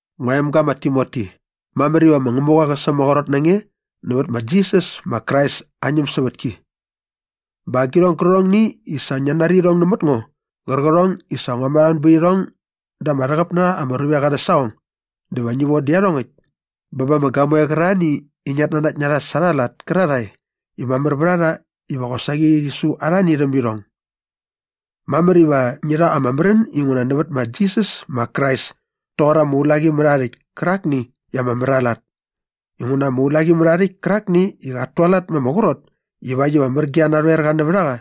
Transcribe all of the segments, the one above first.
Ngua emga ma Timoti, mamär iva ma Ngämuqa qä sämaqrot na nge nävät ma Jisas ma Krais aa ñämsävätki. Bä agirhong gärqärhongni i sa ngia nari irhong nämät ngo qärqärhong i sa ngua märhamän bät irhong da ama rhäqäp na rha ama ruvek arhä saqong dä va ngi von dä iarhongäkt bä ba ama gamoe qärarhani i ngiat nanakt na rha sa arha lat kärarhae i mamär vät a rha iva qosaqi rhi su arhani rhäm irhong. Mamär iva ngi rha ama märän inguna nävät ma Jisas ma Krais toqor ama ulaqimärhaarhäkt kärakni i ama mär aa lat inguna ama ulaqimärhaarhäkt kärakni i qat tualat ma ama qrot ivakt iva mär ge aa narhoerqa nävät a qa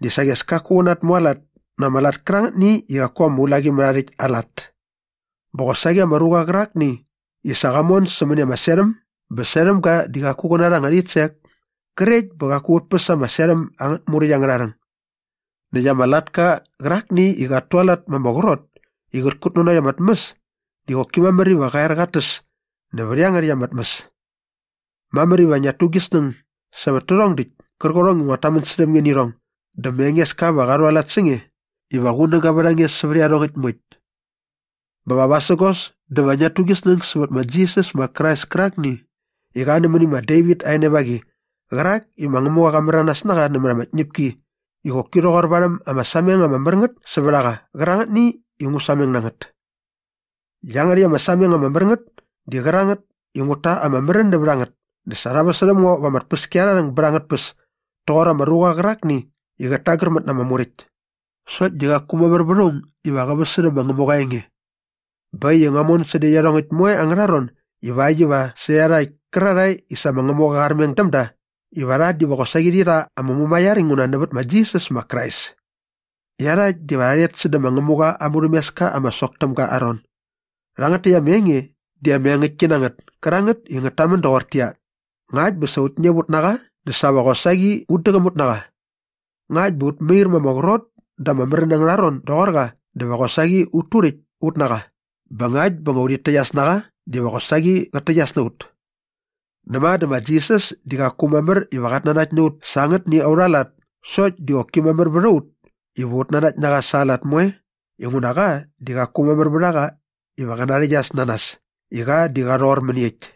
di saqi as kaku qä natmualat na ama lat kärangätni i qaku ama ulaqimärhaarhäkt aa lat. Bä qosaqi ama ruqa qärakni i sa qa mon sämäni ama serhäm bä serhäm ga di qaku qä narha anga rhitsek krekt bä qaku qät päs ama serhäm angät muräkt angärha rhäng. Näkt ama latka qärakni i qat tualat ma ama qrot i qät kutnanokt ama tmäs di qoki mamär iva qa er qat täs nävät iangärhäkt ama tmäs. Mamär iva ngiat tu gi snäng sävät tärhong däkt kärqärhong i nguat tamän särhäm nge nä irhong dä ma Engeska va qa rhualat sä nge iva qunäga vät a nge sävät iarhongäkt moekt. Bä va vasägos dä va ngiat tu gi snäng sävät ma Jisas ma Krais kärakni i qa nämäni ma Devit aa enevaqi qärak i ma Ngämuqa qa märanas na qa nämät ama tñäpki i qoki rhoqor varhäm ama sameng ama mär ngät sävät a qa qärangätni i ngu sameng na ngät. Iangärhäkt ama sameng ama mär ngät di qärangät i ngut ta ama märän nävät a ngät dä sa rha väsärhäm ngo va ama tpäskiarharhäng bät angät tpäs toqor ama ruqa qärakni i qät tagärmät na ama muräkt. Sokt di qaku mamär vät aung iva qä väsärhä ma Ngämuqa aa enge. Bä äkt i ngua mon sädä iarhongäkt moe angärha ron ivakt iva sä iarhakt kärarhae i sa ma Ngämuqa qa armeng däm da iva rha diva qosaqi rhi rha ama mumaiar inguna nävät ma Jisas ma Krais. Iarhakt diva rha rhet sädä ma Ngämuqa aa murhämeska ama sok täm ga aa ron. Rhangät täkt ama enge di ama engäktki na ngät kärangät i ngät tamän doqortäqyia, Ngakt bä sa ut ñäp ut na qa dä sa va qosaqi ut däqäm ut na qa. Ngakt bä ut mair ma ama qrot da ama märän angärha ron doqor qa dä va qosaqi ut turäkt ut na qa bä ngakt bä urhit täqyas na qa diva qosaqi qät täqyas na ut. Näma dä ma Jisas di qaku mamär iva qat nanakt na ut sa angätni aurha lat sokt di qoki mamär vät a ut iva ut nanakt na qa sa aa lat moe inguna qa di qaku mamär vät a qa iva qä narhäqyas na nas i qa di qa rhoqor mäniekt.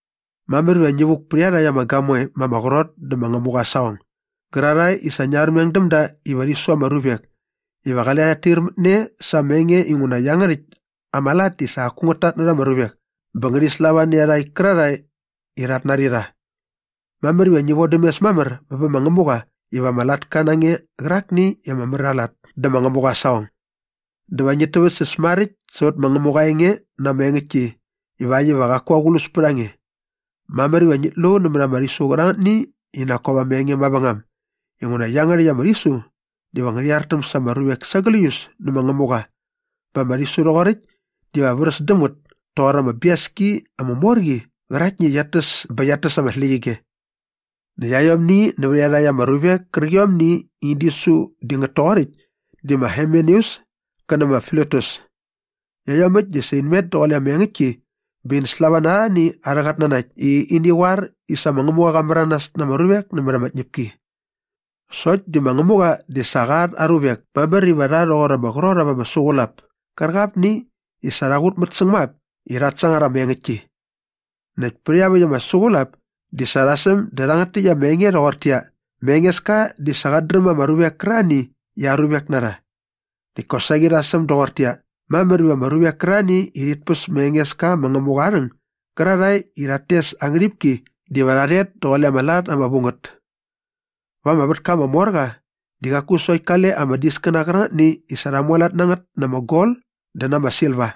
Mamär iva ngi vuk pät iarhakt ama gamoe ma ama qrot dä ma Ngämuqa aa saqong gärarhae i sa ngia armeng däm da iva rhi su ama ruvek iva qale rhat tair mät ne sa ama enge inguna iangärhäkt ama lat di sa qaku ngät tatnärha ama ruvek bä ngärhi slava nä iarhakt kärarhae i rhat nari rha. Mamär iva ngi vodäm mes mamär bä bä ma Ngämuqa iva ama latka na nge qärakni i ama mär aa lat dä ma Ngämuqa aa saqong. Dä va ngit täväktsäs maräkt sävät ma Ngämuqa aa enge na ama engäktki ivakt iva qaku aqlus pät a nge. Mamär iva ngit lu nämät ama rhisu qärangätni i nak kop ama enge mavängam inguna iangärhäkt ama rhisu diva ngärhi artäm sa ama ruvek sa gläius nä ma Ngämuqa bä ama rhisu rhoqoräkt diva vräs däm ngät toqor ama biaski ama mor qi qäraktni i qiat täs bä qiat täs ama släqyige. Näkt aiomni nävät iarhakt ama ruvek kärqiomni i in disu di ngät toqoräkt di ma Himeneus kä nä ma Filetus. Iaiomäkt di sa in met daqule ama engäktki bä ini slava na arhani arhä qatnanakt i ini qoar i sa ma Ngämuqa qa märanas na ama ruvek nämät ama tñäpki. Sokt di ma Ngämuqa di sa qa at aa ruvek mamär iva rha rhoqor ama qrot ap ama suqulap kärqapni i sa rha qutmät säng ma ap i rhat sangar ama engäktki. Näkt pät iaväkt ama suqulap di sa rha säm dä rhangät täkt ama enge rhoqortäqyia, “Ma Engeska di sa qat dräm ama ruvek kärarhani i aa ruvek na rha.” Näkt kosaqi rha säm doqortäqyia, “Mamär iva ama ruvek kärarhani i rhit päs ma Engeska ma Ngämuqa aa rhäng gärarhae i rhat tes aa ngärhipki diva rha rhet daqule ama lat ama vu ngät.” Va ama vätka ama mor qa di qaku sokt kale ama diskäna qärangätni i sa rha mualat na ngät na ama gol dä na ama silva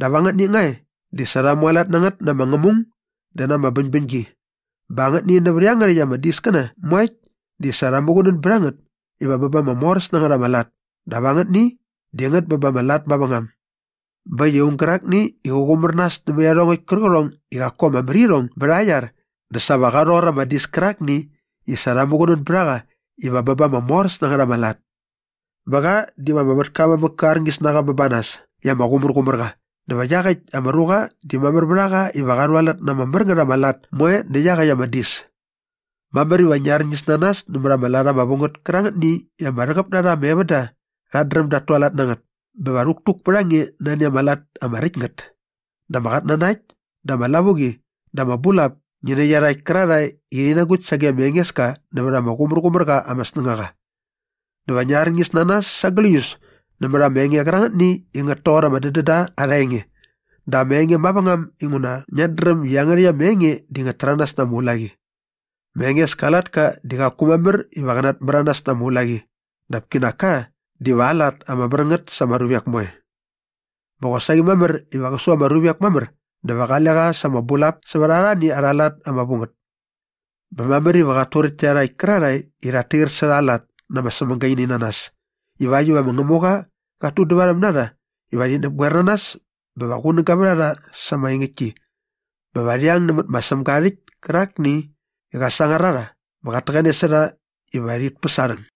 dap angätni nga e di sa rha mualat na ngät na ama ngämung dä na ama bäñbäñgi bä angätni nävät iangärhäkt ama diskäna moekt di sa rha muqunän bät a ngät iva bä ba ama moräs na ngät ama lat dap angätni di ngät bä ba ama lat mavängam. Bä äkt i aung gärakni i qä qumär nas nämät iarhongäkt kärqärhong i qaku ama mär irhong bät aa iar dä sa va qa rhoqor ama dis kärakni i sa rha muqunän bät a qa iva bä ba ama moräs na ngät ama lat. Bä qa diva ama vätka aa mamäk kä arñis na qa bä ba nas i ama qumärqumär qa dä va iaqäkt ama ruqa di mamär vät a qa iva qa rhualat na ama mär ngät ama lat moe nä iaqäkt ama dis. Mamär iva ngi arñis na nas nämät ama lat ama vu ngät kärangätni i ama rhäqäp na rha ama evända rhat dräm dat tualat na ngät bä va rhäktuk pät a nge nani ama lat ama räkt ngät dä ama qatnanakt dä ama lavuqi dä ama bulap ngi nä iarhakt kärarhae i rhi nagukt sage ma Engeska nävät ama qumärqumär qa ama snängaqa. Dä va ngi arñis na nas sa gläius nämät ama enge qärangätni i ngät toqor ama dädända arha enge dä ama enge mavängam inguna ngiat dräm i iangärhäkt ama enge di ngät täranas na ama ulaqi. Ma Engeska aa latka di qaku mamär iva qä natmäranas na ama ulaqi dap kinak ka diva aa lat ama mär ngät sa ama ruvek moe. Bä qosaqi mamär iva qä su ama ruvek mamär dä va qale qa sa ama bulap sävät arhani arha lat ama vu ngät. Bä mamär iva qat turäkt tä iarhakt kärarhae i rhat tair särha aa lat na ama sämagaininanas ivakt iva ma Ngämuqa qat tudävarhäm na rha iva rhi näpgoer na nas bä va qunäga vät a rha sa ama engäktki bä va rhi ang nämät ma Sämga aa rhäkt kärakni i qa sangar a rha bä qat täqäne sa rha iva rhit päs aa rhäng.